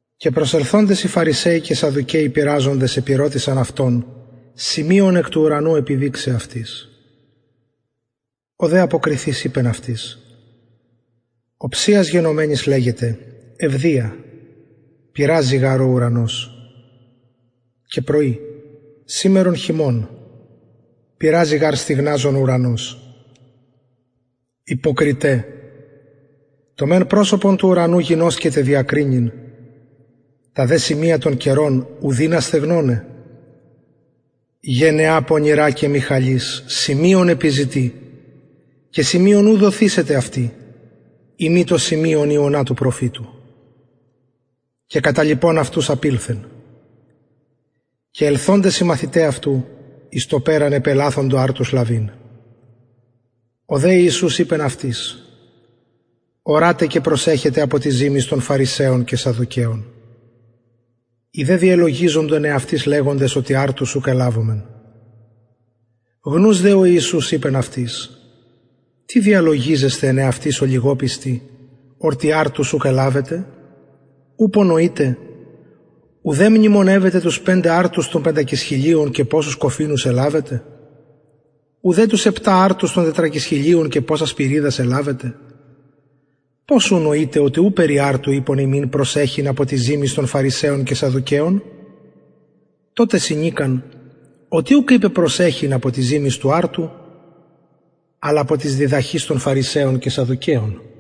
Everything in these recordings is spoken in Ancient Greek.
και προσελθοντες οι φαρισαιοι και σαδδουκαιοι πειραζοντες επηρωτησαν αυτον σημειον εκ του ουρανου επιδειξαι αυτοις ο δε αποκριθεις ειπεν αυτοις οψιας γενομενης λεγετε ευδια πυρραζει γαρ ο ουρανος και πρωι σημερον χειμων πυρραζει γαρ στυγναζων ο ουρανος υποκριται το μεν προσωπον του ουρανου γινωσκετε διακρινειν τα δε σημεια των καιρων ου δυνασθε γενεα πονηρα και μοιχαλις σημειον επιζητει και σημειον ου δοθησεται αυτη ει μη το σημειον ιωνα του προφητου και καταλιπων αυτους απηλθεν και ελθοντες οι μαθηται αυτου εις το περαν επελαθοντο αρτους λαβειν ο δε ιησους ειπεν αυτοις ορατε και προσεχετε απο της ζυμης των φαρισαιων και σαδδουκαιων οι δε διελογιζοντο εν εαυτοις λεγοντες οτι αρτους ουκ ελαβομεν γνους δε ο ιησους ειπεν αυτοις τι διαλογιζεσθε εν εαυτοις ολιγοπιστοι οτι αρτους ουκ ελαβετε ουπω νοειτε ουδε μνημονευετε τους πεντε αρτους των πεντακισχιλιων και ποσους κοφινους ελαβετε ουδε τους επτα αρτους των τετρακισχιλιων και ποσας σπυριδας ελαβετε πως ου νοειτε οτι ου περι αρτου ειπον υμιν προσεχειν απο της ζυμης των φαρισαιων και σαδδουκαιων τοτε συνηκαν οτι ουκ ειπεν προσεχειν απο της ζυμης του αρτου αλλα απο της διδαχης των φαρισαιων και σαδδουκαιων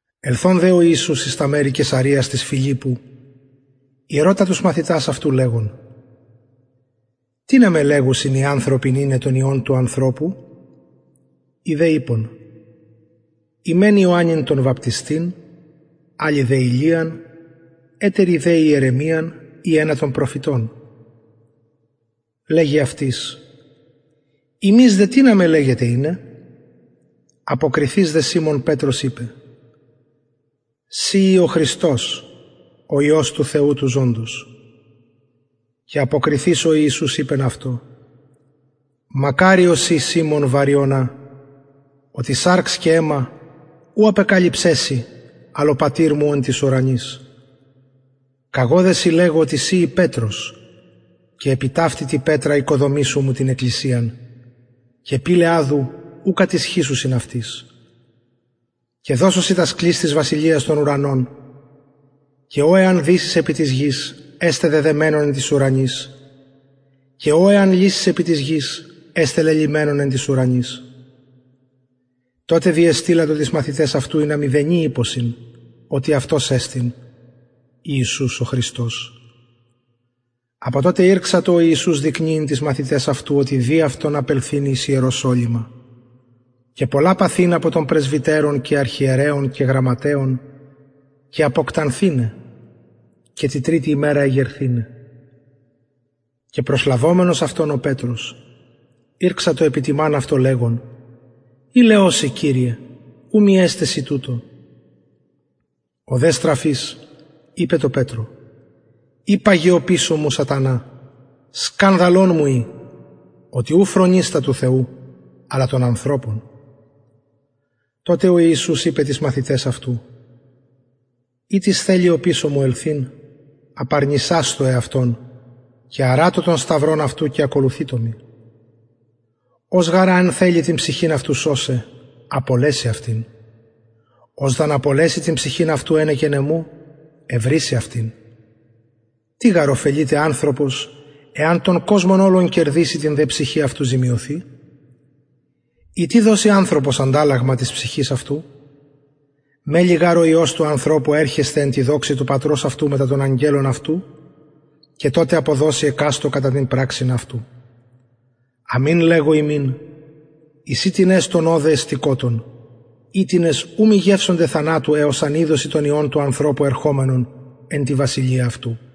ελθων δε ο ιησους εις τα μερη καισαρειας της φιλιππου ηρωτα τους μαθητας αυτου λεγων τινα με λεγουσιν οι ανθρωποι ειναι τον υιον του ανθρωπου οι δε ειπον οι μεν ιωαννην τον βαπτιστην αλλοι δε ηλιαν ετεροι δε ιερεμιαν η ενα των προφητων λεγει αυτοις υμεις δε τινα με λεγετε ειναι αποκριθεις δε σιμων πετρος ειπεν συ ει ο χριστος ο υιος του θεου του ζωντος και αποκριθεις ο ιησους ειπεν αυτω μακαριος ει σιμων βαριωνα οτι σαρξ και αιμα ουκ απεκαλυψεν σοι αλλ ο πατηρ μου ο εν τοις ουρανοις καγω δε σοι λεγω οτι συ ει πετρος και επι ταυτη τη πετρα οικοδομησω μου την εκκλησιαν και πυλαι αδου ου κατισχυσουσιν αυτης και δωσω σοι τας κλεις της βασιλειας των ουρανων και ο εαν δησης επι της γης εσται δεδεμενον εν τοις ουρανοις και ο εαν λυσης επι της γης εσται λελυμενον εν τοις ουρανοις τοτε διεστειλατο τοις μαθηταις αυτου ινα μηδενι ειπωσιν οτι αυτος εστιν ιησους ο χριστος απο τοτε ηρξατο ο ιησους δεικνυειν τοις μαθηταις αυτου οτι δει αυτον απελθειν εις ιεροσολυμα και πολλα παθειν απο των πρεσβυτερων και αρχιερεων και γραμματεων και αποκτανθηναι και τη τριτη ημερα εγερθηναι και προσλαβομενος αυτον ο πετρος ηρξατο επιτιμαν αυτω λεγων ιλεως σοι κυριε ου μη εσται σοι τουτο ο δε στραφεις ειπεν τω πετρω υπαγε οπισω μου σατανα σκανδαλον μου ει οτι ου φρονεις τα του θεου αλλα τα των ανθρωπων τοτε ο ιησους ειπεν τοις μαθηταις αυτου ει τις θελει οπισω μου ελθειν απαρνησασθω εαυτον και αρατω τον σταυρον αυτου και ακολουθειτω μοι ος γαρ αν θελη την ψυχην αυτου σωσαι απολεσει αυτην ος δ αν απολεση την ψυχην αυτου ενεκεν εμου ευρησει αυτην τι γαρ ωφελειται ανθρωπος εαν τον κοσμον ολον κερδηση την δε ψυχην αυτου ζημιωθη η τι δωσει ανθρωπος ανταλλαγμα της ψυχης αυτου μελλει γαρ ο υιος του ανθρωπου ερχεσθαι εν τη δοξη του πατρος αυτου μετα των αγγελων αυτου και τοτε αποδωσει εκαστω κατα την πραξιν αυτου αμην λεγω υμιν εισιν τινες ωδε εστωτες οιτινες ου μη γευσωνται θανατου εως αν ιδωσιν τον υιον του ανθρωπου ερχομενον εν τη βασιλεια αυτου